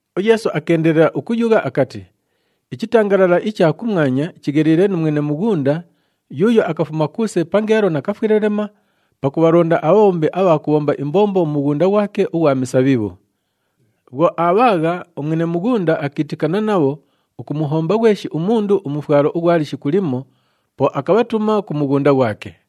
UYeesu akeendelela ukuyugha akati, “Ichitangalala icha kumwanya chigheliile nu mwene mughunda yuuyo akafuma kuuse pangeelo nakafwelelema pakubhalonda abhabhombi abha kubhomba imbombo mu mughunda ghwake ughwa misabhibhu. Bhwo aabhaagha, umwene mughunda akiitikana nabho ukumuhomba ghweshi umundu umufwalo ughwa lishiku limo, po akabhatuma ku mughunda ghwake.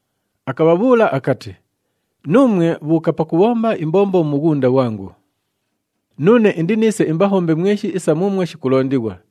Akabhabhuula akati, ‘Nuumwe bhuuka pakubhomba imbombo mu mughunda ghwangu. Nuune indiniise imbahombe mweshi isa muumwo shikulondighwa.’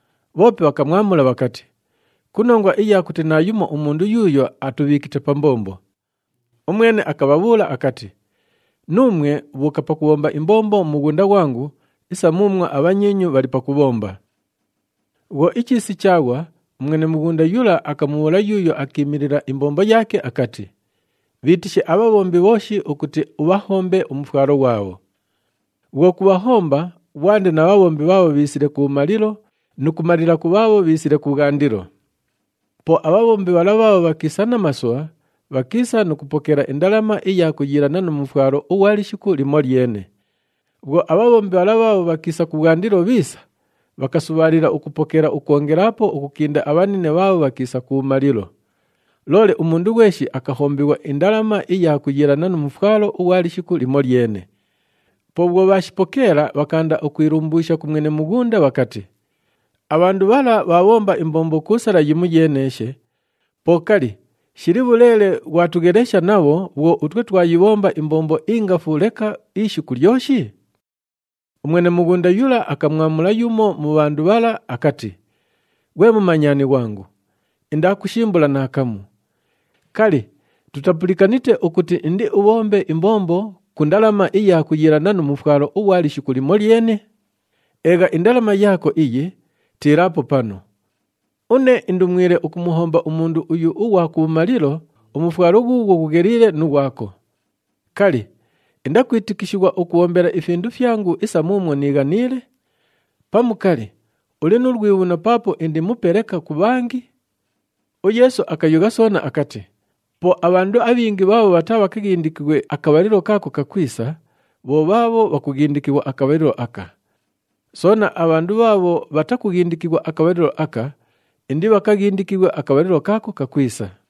Bhoope bhakamwamula bhakati, ‘Ku nongwa iya kuti naayumo umundu yuuyo atubhiikite pa mbombo.’ Umwene akabhabhuula akati, ‘Nuumwe bhuuka pakubhomba imbombo mu mughunda ghwangu isa muumwo abhanyiinyu bhali pakubhomba.’ “Bhwo ichiisi chaaghwa, umwene mughunda yula akamubhuula yuuyo akiimilila imbombo yaake akati, ‘Bhiitishe abhabhombi bhooshi ukuti ubhahombe umufwalo ghwabho. Bhwo kubhahomba, ghwande na bhabhombi bhaabho bhiisile kubhumalilo nu kumalila ku bhaabho bhiisile kubhwandilo.’ Po abhabhombi bhala bhaabho bhakiisa namasubha, bhakiisa nu kupokeela indalama iya kuyiilana nu mufwalo ughwa lishiku limolyene. Bhwo abhabhombi bhala bhaabho bhakiisa kubhwandilo bhiisa, bhakasubhaalila ukupokeela ukwongelaapo ukukinda abhanine bhaabho bhakiisa kubhumalilo. Loole umundu ghweshi akahombighwa indalama iya kuyiilana nu mufwalo ughwa lishiku limolyene. Po bhwo bhaashipokeela, bhakaanda ukwilumbuusha ku mwene mughunda bhakati, ‘Abhandu bhala bhaabhomba imbombo ku sala yimoyeeneeshe, po kali, shili bhuleele ghwatughelesha nabho bhwo utwe twayibhomba imbombo ingafu leka ishiku lyoshi?’ Umwene mughunda yula akamwamula yumo mu bhandu bhala akati, ‘Ghwe mumanyani ghwangu, indaakushimbula naakamu. Kali, tutapulikanite ukuti indiubhombe imbombo ku ndalama iya kuyiilana nu mufwalo ughwa lishiku limolyene? Eegha indalama yaako iyi, tiilaapo panu! Une indumwile ukumuhomba umundu uyu ughwa kubhumalilo umufwalo ghuughwo ghugheliile nu ghwako. Kali, indakwitikishighwa ukubhombela ifindu fyangu isa muumwo niighaniile? Pamu kali, uli nu lwibhuno paapo indi mupe leka ku bhangi?’” UYeesu akayugha soona akati, “Po abhandu abhingi bhaabho bhataabhakaghindikighwe akabhalilo kaako kakwisa, bho bhaabho bhakughindikighwa akabhalilo aka. Soona, abhandu bhaabho bhatakughindikighwa akabhalilo aka, indibhakaghindikighwe akabhalilo kaako kakwisa.”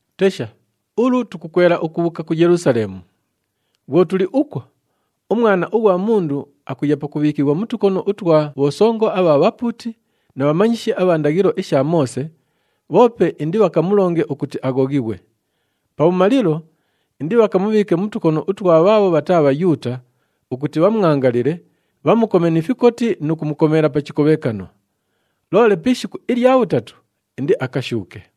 “Tesha, ulu tukukwela ukubhuuka ku Yelusaleemu. Bhwo tuli ukwo, uMwana ughwa Mundu akuya pakubhiikighwa mu tukono utwa bhosongo abha bhapuuti na bhamanyishi abha ndaghilo isha Moose, bhoope indibhakamulonge ukuti aghoghighwe. Pabhumalilo, indibhakamubhiike mu tukono utwa bhaabho bhataa Bhayuuta ukuti bhamwangalile, bhamukome ni fikoti nu kumukomeela pa chikobhekano. Loole pi ishiku ilya bhutatu, indiakashuuke.”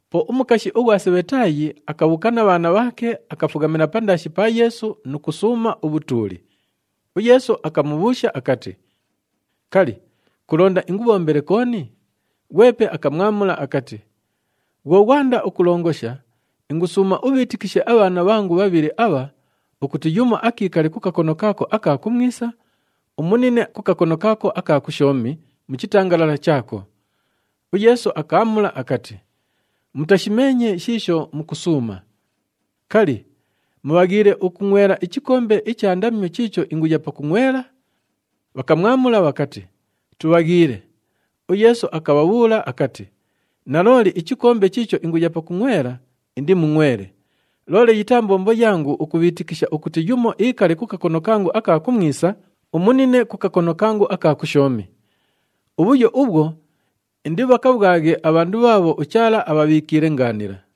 Po umukashi ughwa Sebhetaayi akabhuuka na bhaana bhaake, akafughamila pandaashi pa Yeesu nu kusuuma ubhutuuli. UYeesu akamubhuusha akati, “Kali, kulonda ingubhombele kooni?” Ghwepe akamwamula akati, “Bhwo ghwanda ukulongosha, ingusuuma ubhiitikishe abhaana bhangu bhabhili abha ukuti yumo akiikale ku kakono kaako aka kumwisa, umunine ku kakono kaako aka kushoomi mu chitangalala chaako.” UYeesu akaamula akati, “Mutashimeenye shiisho mukusuuma. Kali, mubhaghiile ukungʼwela ichikombe icha ndamyo chiicho inguya pakungʼwela?” Bhakamwamula bhakati, “Tubhaghiile.” UYeesu akabhabhuula akati, “Nalooli ichikombe chiicho inguya pakungʼwela indimungʼwele, loole yitaa mbombo yangu ukubhiitikisha ukuti yumo iikale ku kakono kangu aka kumwisa, umunine ku kakono kangu aka kushoomi. Ubhuyo ubhwo indibhakabhwaghe abhandu bhaabho uChaala abhabhiikiile ngaanila.”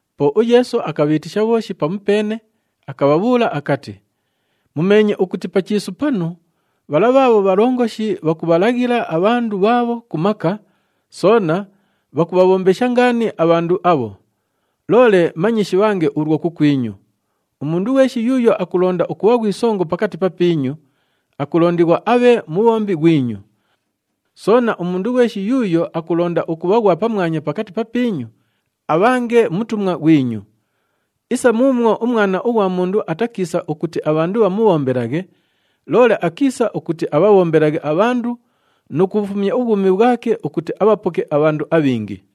Po uYeesu akabhiitisha bhooshi pamupeene, akabhabhuula akati, “Mumeenye ukuti pa chiisu panu, bhala bhaabho bhalongoshi, bhakubhalaghila abhandu bhaabho ku maka, soona bhakubhabhombesha ngaani abhandu abho. Loole manye shibhange ulwo kukwinyu. Umundu ghweshi yuuyo akulonda ukubha ghwi songo pakati papiinyu, akulondighwa abhe mubhombi ghwinyu. Soona, umundu ghweshi yuuyo akulonda ukubha ghwa pamwanya pakati papiinyu, abhange mutumwa ghwinyu. Isa muumwo uMwana ughwa Mundu atakiisa ukuti abhandu bhamubhombelaghe, loole akiisa ukuti abhabhombelaghe abhandu nu kubhufumya ubhwumi bhwake ukuti abhapoke abhandu abhingi.”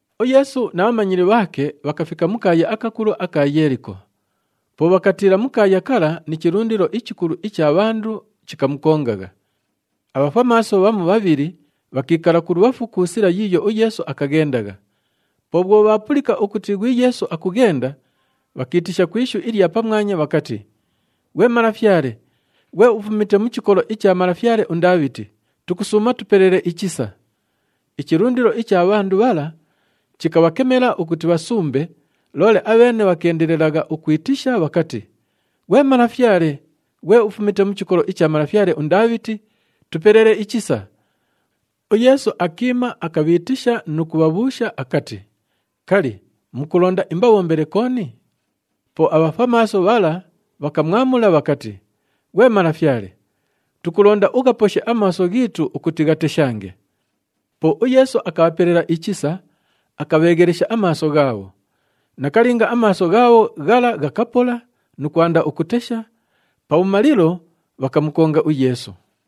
UYeesu na bhamanyili bhaake bhakafika mu kaaya akakulu aka Yeeliko. Po bhakatiila mu kaaya kala ni chilundilo ichikulu icha bhandu chikamukongagha. Abhafwamaaso bhamu bhabhili bhakiikala kulubhafu ku sila yiiyo uYeesu akaghendagha. Po bhwo bhaapulika ukuti ghwi Yeesu akughenda, bhakiitisha ku ishu ilya pamwanya bhakati, “Ghwe Malafyale, ghwe ufumite mu chikolo icha malafyale uNdaabhiti, tukusuuma tupelele ichisa!” Ichilundilo icha bhandu bhala chikabhakemela ukuti bhasumbe, loole abheene bhakeendelelagha ukwitisha bhakati, “Ghwe Malafyale, ghwe ufumite mu chikolo icha malafyale uNdaabhiti, tupelele ichisa!” UYeesu akiima, akabhiitisha nu kubhabhuusha akati, “Kali, mukulonda imbabhombele kooni?” Po abhafwamaaso bhala bhakamwamula bhakati, “Ghwe Malafyale, tukulonda ughaposhe amaaso ghiitu ukuti ghateshange.” Po uYeesu akabhapelela ichisa, akabheeghelesha amaaso ghaabho. Nakalinga, amaaso ghaabho ghala ghakapola nu kwanda ukutesha, pabhumalilo, bhakamukonga uYeesu.